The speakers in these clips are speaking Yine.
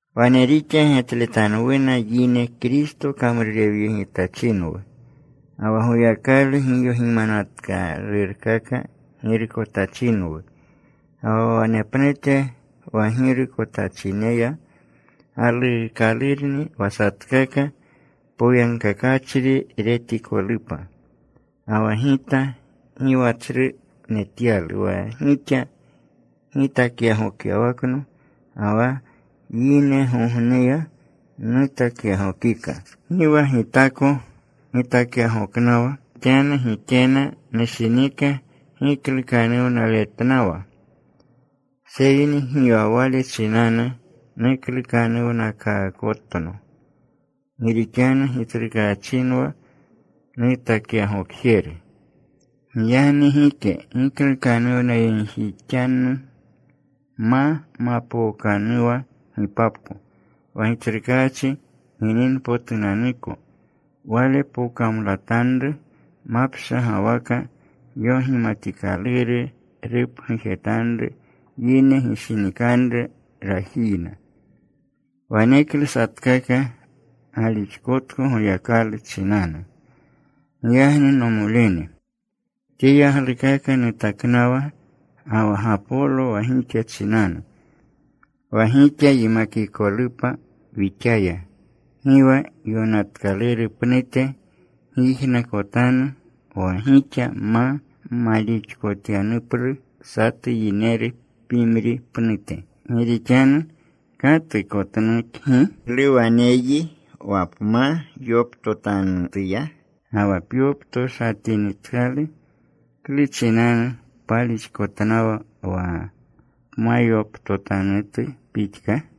Wane rixa getletanwuna yine Kristo kamrurewyegitachinwu, ga wa Goyakalu giyogimanatanrukaka girukotachinwu. Ga wa wanepnute wa girukotachineya galuukalurni wa satkaka poyagkakachri retikolupa. Ga wa gita gi wa tsru netyalu wa gixa gitakyagokyawakno, ga wa yinegogneya nutakyagokika. Ga wa gi gitako gitakyagoknawa. Gi rixanu gikena nushinika giklukanuwnaletnawa, seyni gi wale chinanu muklukanuwnakaakotno. Gi rixanu Gitsrukaachinwa nutakyagokjeru. Giyagni gike giklukanuwnayegjixanu ma mapookanuwa gipapko, wa Gitsrukaachi gininpotunanuko. Wale pokamlatanru mapshagawaka yogimatikaluru. Rupgujetanru yine gishinikanru rajiyna. Waneklu satkaka galixkotko Goyakalu chinanu. Giyagni, nomolene, tye yaglukaka nutaknawa ga wa Gapolo wa gixa chinanu, wa gixa yimakikolupa wixaya gi wa yonatkaluru pnute gyijnakotanu wa gixa ma malixkotyanuplu satu yineru pimri pnute. Gi rixanu ¿katu kotnukgi? ¿Klu waneyyi wa pma yoptotanutuya? ¿Ga wa pyoptoshatinitkalu, klu chinanu palixkotnawa wa pmayoptotanutu pixka?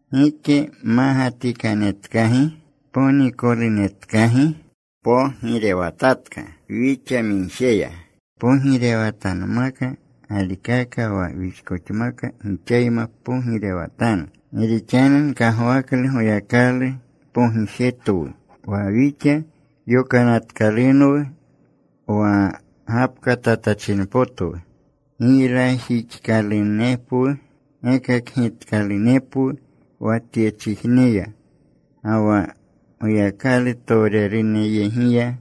¿Gike mmagatikanetkagi? ¿Ponikolunetkagi? ¿Mpogirewatatka wixamigjeya? Mpogirewatanmaka galikaka wa wixkoxamka gixayma pogirewatanu. Gi rixanu nkagwaklu Goyakalu pogijetwu wa wixa yokanatkalunwu wa gapkatatachinpotwu, giylajixkalunepwu gekakgitkalunepwu wa tyechijneya, ga wa Goyakalutowrerunyegiya,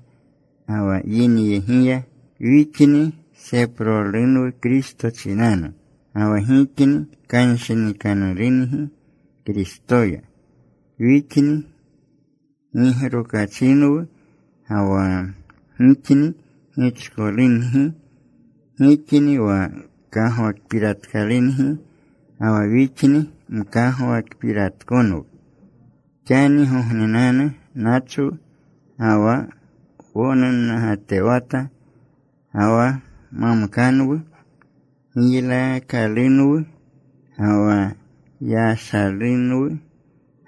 ga wa yinyegiya. Wixni seprolunwu Kristo chinanu, ga wa gixni kanshinikanurungi Kristoya. Wixni gigrokachinwu ga wa gixni gichkolungi. Gixni wa kagwakpiratkalungi, ga wa wixni mkagwakpiratkonwu. Xanigognenanu nachwu, ga wa wonunnagatewata, ga wa mamkanwu, giylaakalunwu, ga wa yashalunwu.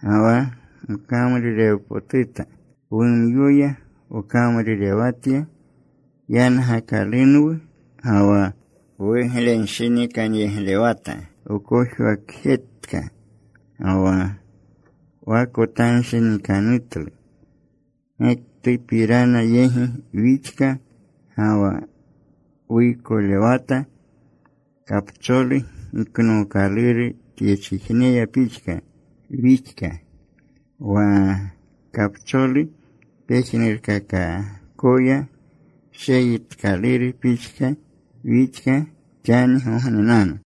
Ga wa wkamrurewpotuta. Wumyoya wkamrurewatya. Yangakalunwu ga wa wuglenshinikanyeglewata. Wkojwakjetka ga wa wakotanshinikanutlu. Gektupirana yegi wixka ga wa wuykolewata. Kapcholu giknookaluru tyechijneya pixka wixka. Wa kapcholu pejnurkakakoya sheyitkaluru pixka wixka xanigognenanu.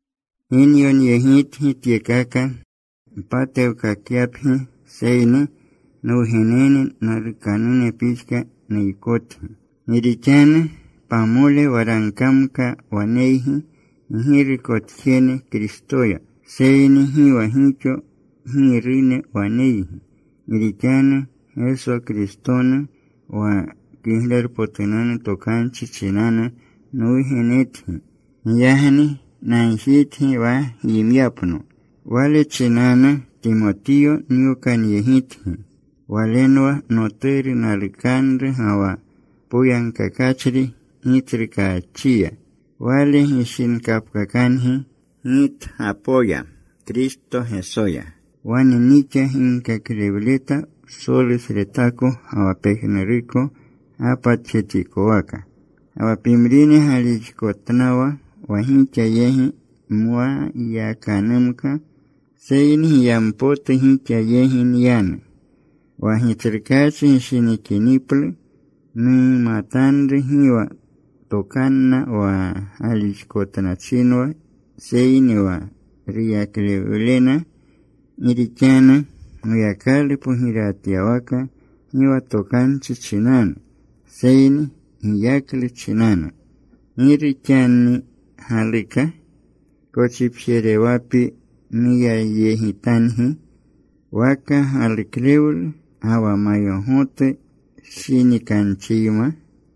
Gi nyonyegitgi tyekaka npatewkakyapgi, seyni nwugenene nalukanune pixka nuykotgi. Gi rixanu pamole waragkamka waneygi ggirukotjene Kristoya, seyni gi wa gixo girune waneygi. Gi rixanu Geso Kristonu wa Kiglerpotunanu Tokanchi chinanu nwugenetgi. Giyagni nagjitgi wa gyimyapno. Wale chinanu Timotiyo nyokanyegitgi. Walenwa noturu nalukanru ga wa poyagkakachri Gitsrukaachiya. Wale gishinkapkakangi gitgapoya Kristo Gesoya. Wane nixa ginkaklewleta psolusretako ga wa pejnuruko gapatjetikowaka. Ga wa pimrine galixkotnawa wa gixa yegi nma yakanumka. Seyni giyampotu gixa yegi nyanu, wa Gitsrukaachi gishinikiniplu. Numatanru gi wa tokanna wa galixkotnachinwa, seyni wa ruyaklewlena. Gi rixanu Goyakalu pogirewatyawaka gi wa tokanchi chinanu, seyni giyaklu chinanu. ¿Giru xani galuka? ¿kochipjerewapi nuyayegitangi, waka galuklewlu ga wa mayogotu shinikanchiyma?